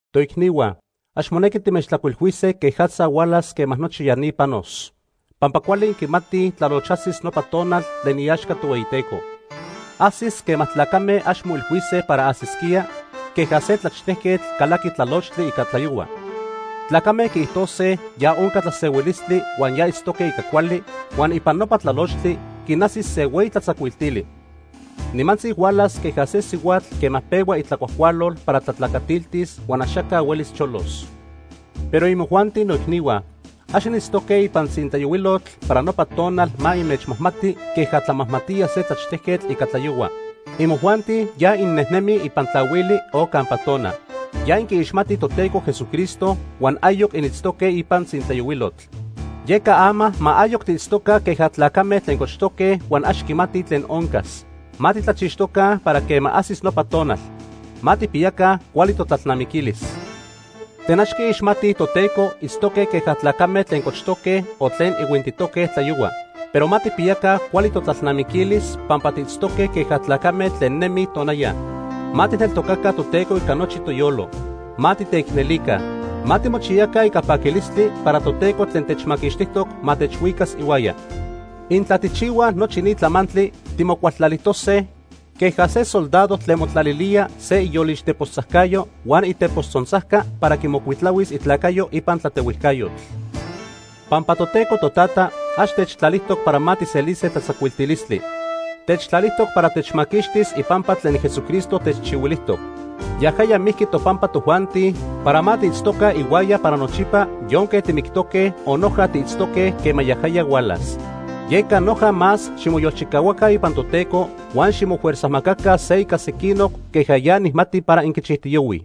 Toicnihua, ax monequi timechtlajcuilhuise quejatza huan quema nochi ya ni panos. Pampa cuali inquimatij tlaloch ajsis nopa tonal tlen iaxca Tohueyiteco. Ajsis quema tlacame ax moilhuise para ajsisquía, queja se tlaxtejquetl calaqui tlalochtli ica tlayohua. Tlacame quiijtojtose ya onca tlasehuilistli huan ya itztoque ica cuali, huan ipan nopa tlalochtli quinajsis se hueyi tlatzacuiltili. Nimantzi hualas queja se sihuatl quema pehua itlacuajcualol para tlatlacatiltis huan axaca huelis cholos. Pero imojuanti noicnihua, ax initztoque ipan tzintlayohuilotl para nopa tonal ma inmechmajmati queja tlamajmatía se tlaxtejquetl ica tlayohua. Imojuanti ya innejnemij ipan tlahuili o campa tona. Ya inquiixmatij Toteco Jesucristo huan ayoc initztoque ipan tzintlayohuilotl. Yeca ama ma ayoc tiitztoca queja tlacame tlen cochtoque huan ax quimatij tlen oncas. Ma titlachixtoca para quema ajsis nopa tonal. Ma tijpiyaca cuali totlalnamiquilis. Tlen ax quiixmatij Toteco itztoque queja tlacame tlen cochtoque o tlen ihuintitoque tlayohua. Pero ma tijpiyaca cuali totlalnamiquilis pampa tiitztoque queja tlacame tlen nemij tonaya. Ma tijneltocaca Toteco ica nochi toyolo. Ma titeicnelica. Ma timochiyaca ica paquilistli para Toteco tlen techmaquixtijtoc ma techhuicas ihuaya. Intla tijchihuaj nochi ni tlamantli, timocualtlalijtose queja se soldado tlen motlalilía se iyolix tepostzajcayo huan itepos tzontzajca para quimocuitlahuis itlacayo ipan tlatehuijcayotl. Pampa Toteco Totata ax techtlalijtoc para ma tijselise tlatzacuiltilistli. Techtlalijtoc para techmaquixtis ipampa tlen Jesucristo techchihuilijtoc. Yajaya mijqui topampa tojuanti para ma tiitztoca ihuaya para nochipa yonque timictoque o noja tiitztoque quema yajaya hualas. Yeca noja más ximoyolchicahuaca ipan Toteco huan ximofuerzajmacaca se ica sequinoc queja ya nijmati para inquichijtiyohuij.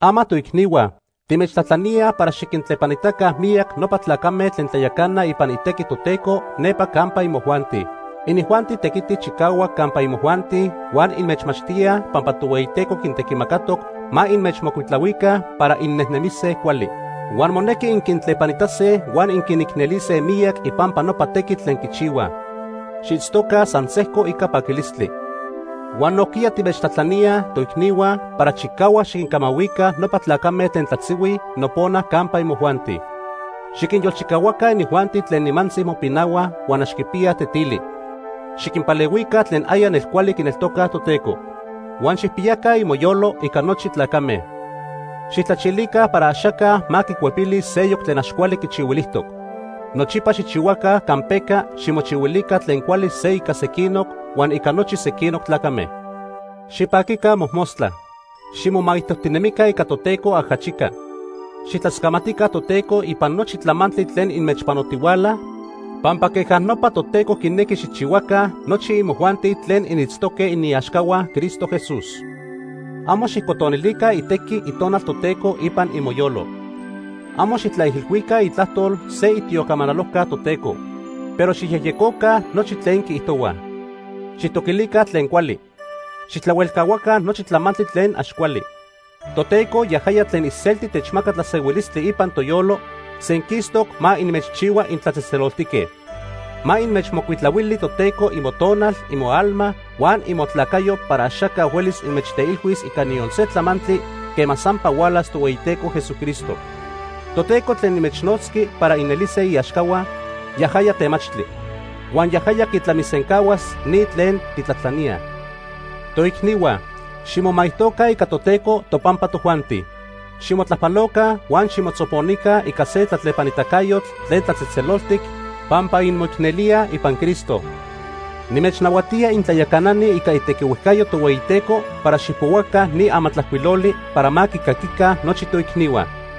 Ama toicnihua, timechtlajtlaníaj para xiquintlepanitaca miyac nopa tlacame tlen tlayacanaj ipan itequi Toteco nepa campa imojuanti. Inijuanti tequitij chicahuac campa imojuanti huan inmechmachtíaj pampa Tohueyiteco quintequimacatoc ma inmechmocuitlahuica para innejnemise cuali. Huan monequi inquintlepanitase huan inquinicnelise miyac ipampa nopa tequitl tlen quichihuaj. Xiitztoca san sejco ica paquilistli. Huan nojquiya timechtlajtlaníaj, toicnihua, para chicahuac xiquincamahuica nopa tlacame tlen tlatzihuij nopona campa imojuanti. Xiquinyolchicahuaca inijuanti tlen nimantzi mopinahuaj huan ax quipiyaj tetili. Xiquinpalehuica tlen aya nelcuali quineltocaj Toteco. Huan xijpiyaca imoyolo ica nochi tlacame. Xijtlachilica para axaca ma quicuepilis seyoc tlen ax cuali quichihuilijtoc. Nochipa xijchihuaca campeca ximochihuilica tlen cuali se ica sequinoc huan ica nochi sequinoc tlacame. Xipaquica mojmostla. Ximomaijtojtinemica ica Toteco ajachica. Xijtlascamatica Toteco ipan nochi tlamantli tlen inmechpanotihuala pampa queja nopa Toteco quinequi xijchihuaca nochi imojuanti tlen initztoque iniaxcahua Cristo Jesús. Amo xijcotonilica itequi Itonal Toteco ipan imoyolo. Amo xijtlaijilhuica itlajtol se itiocamanalojca Toteco. Pero xijyejyecoca nochi tlen quiijtohuaj. Xijtoquilica tlen cuali. Xijtlahuelcahuaca nochi tlamantli tlen ax cuali. Toteco, yajaya tlen iselti techmaca tlasehuilistli ipan toyolo, senquistoc ma inmechchihua intlatzejtzeloltique. Ma inmechmocuitlahuili Toteco imotonal, imoalma, huan imotlacayo para axaca huelis inmechteilhuis ica niyon se tlamantli quema sampa hualas Tohueyiteco Jesucristo. Toteco tlen inmechnotzqui para inelise iaxcahua, yajaya temachtli. Huan yajaya quitlamisencahuas ni tlen tijtlajtlaníaj. Toicnihua, ximomaijtoca ica Toteco topampa tojuanti. Ximotlajpaloca huan ximotzoponica ica se tlatlepanitacayotl tlen tlatzejtzeloltic pampa inmoicnelíaj ipan Cristo. Nimechnahuatía intlayacanani ica itequihuejcayo Tohueyiteco para xijpohuaca ni amatlajcuiloli para ma quicaquica nochi toicnihua.